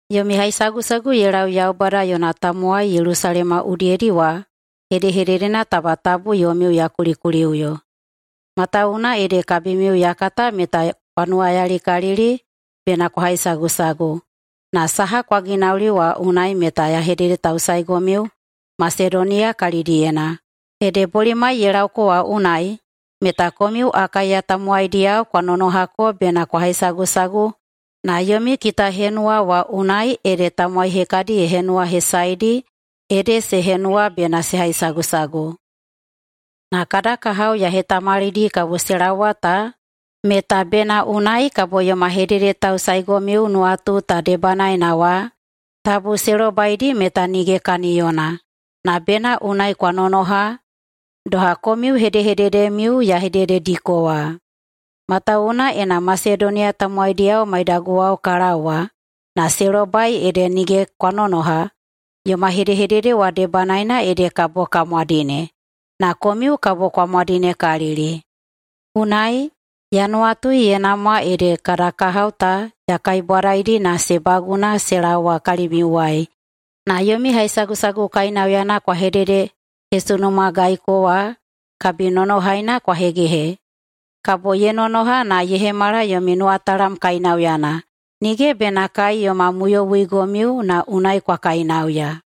Yomi haisagusagu ye lau Yaubada yona tamowai Yelusalema udiyedi wa hedehededena taba tabu yomiu ya kulikuliꞌuyo. Matawuwuna ede kabimiu ya kata meta kwa nuwayalikalili bena kwa haisagusagu, na saha kwa ginauli wa unai meta ya hededetausaeigomiu Masedoniya kalidiyena, ede bolimai ye laoko wa unai meta komiu Akaiya tamowaidiyao kwa nonohako bena kwa haisagusagu na yomi kitahenuwana wa unai ede tamowai hekadi ye henuwahesaeidi, ede se henuwa bena se haisagusagu. Na kada kahao ya hetamalidi kabo se laowa ta meta bena unai kabo yoma hededetausaeigomiu nuwatu ta debanaena wa tabu se lobaidi meta nige kaniyona, na bena unai kwa nonoha, doha komiu hedehededemiu ya hededediko wa. Matawuwuna ena Masedoniya tamowaidiyao maidaguwao ka laowa na se lobai ede nige kwa nonoha, yoma hedehedede wa debanaena ede kabo ka mwadine, na komiu kabo kwa mwadinekalili. Unai ya nuwatui ye namwa ede kada kahao ta ya kaibwadaidi na se baguna se laowa kalimiuwai na yomi haisagusagu kainauyana kwa hededehesunumagaiko wa kabinonohaina kwa hegehe. Kabo ye nonoha na ye hemala yomi nuwatalam kainauyana, nige bena kai yoma muyowuigomiu na unai kwa kainauya.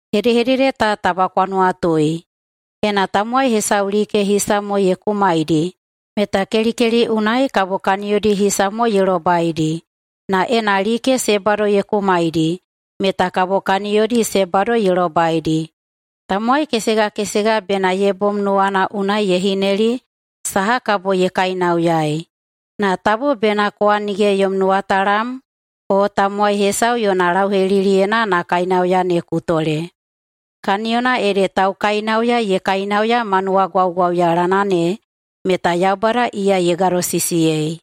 Hedehedede ta taba kwa nuwatui: Ena tamowai hesau like hisa mo ye kumaidi meta kelikeli unai kabo kaniyodi hisa mo ye lobaidi, na ena like se bado ye kumaidi meta kabo kaniyodi se bado ye lobaidi. Tamowai kesegakesega bena ye bom nuwana unai ye hineli saha kabo ye kainauyaei, na tabu bena kowa nige yom nuwatalam o tamowai hesau yona lauheliliyena na kainauya ne ku tole, kaniyona ede taukainauya ye kainauya ma nuwagwauyalana ne meta Yaubada iya ye gadosisiyei.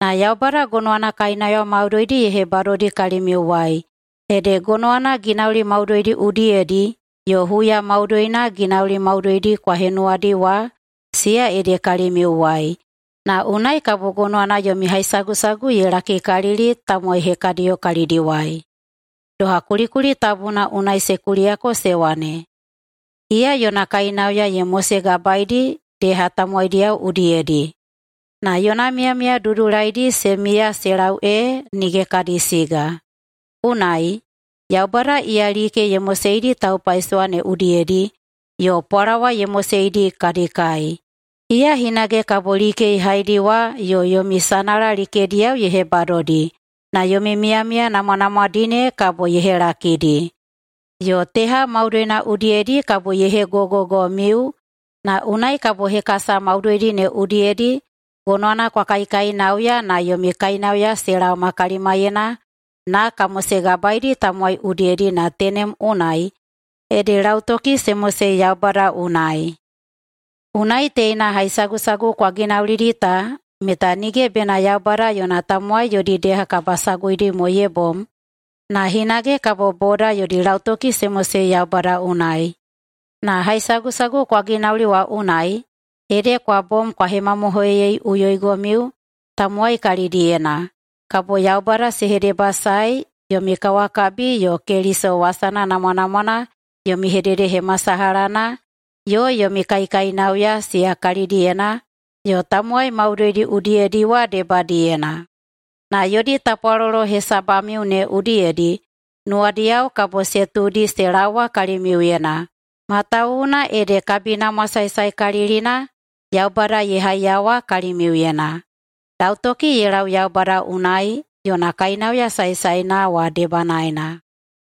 Na Yaubada gonowana kainauya maudoidi ye hebadodi kalimiuwai, ede gonowana ginauli maudoidi udiyedi yo huya maudoina ginauli maudoidi kwa henuwadi wa siya ede kalimiuwai, na unai kabo gonowana yomi haisagusagu ye lakikalili tamowai hekadiyo kalidiwai. Doha kulikuli tabuna unai se kuliyako se wane, “Iya yona kainauya ye mosegabaeidi deha tamowaidiyao udiyedi na yona miyamiya dudulaidi se miya se lau ee nige kadi siga.” Unai, Yaubada iya like ye moseidi taupaisowa ne udiyedi yo pwalawa ye moseidi kadi kai, iya hinage kabo like ye haidiwa yo yomi sanala likediyao ye hebadodi na yomi miyamiya namwanamwadi ne kabo ye helakidi. Yo teha maudoina udiyedi kabo ye hegogogomiu na unai kabo hekasa maudoidi ne udiyedi gonowana kwa kaikainauya na yomi kainauya se laoma kalimaiyena na ka mosegabaeidi tamowai udiyedi na tenem unai ede lautoki se mosei Yaubada unai. Unai teina haisagusagu kwa ginaulidi ta meta nige bena Yaubada yona tamowai yodi deha kabasaguidi mo ye bom, na hinage kabo boda yodi lautoki se mosei Yaubada unai. Na haisagusagu kwa ginauli wa unai, ede kwa bom kwa hemamohoiyeiꞌuyoigomiu tamowai kalidiyena, kabo Yaubada se hedebasaei yomi kawakabi yo Keliso wasana namwanamwana yomi hededehemasalahana yo yomi kaikainauya siya kalidiyena yo tamowai maudoidi udiyedi wa debadiyena. Na yodi tapwalolo hesabamiu ne udiyedi nuwadiyao kabo se tuudi se laowa kalimiuyena, matawuwuna ede kabinamwa saesaekalilina Yaubada ye haiyawa kalimiuyena. Lautoki ye lau Yaubada unai yona kainauya saesaena wa debanaena!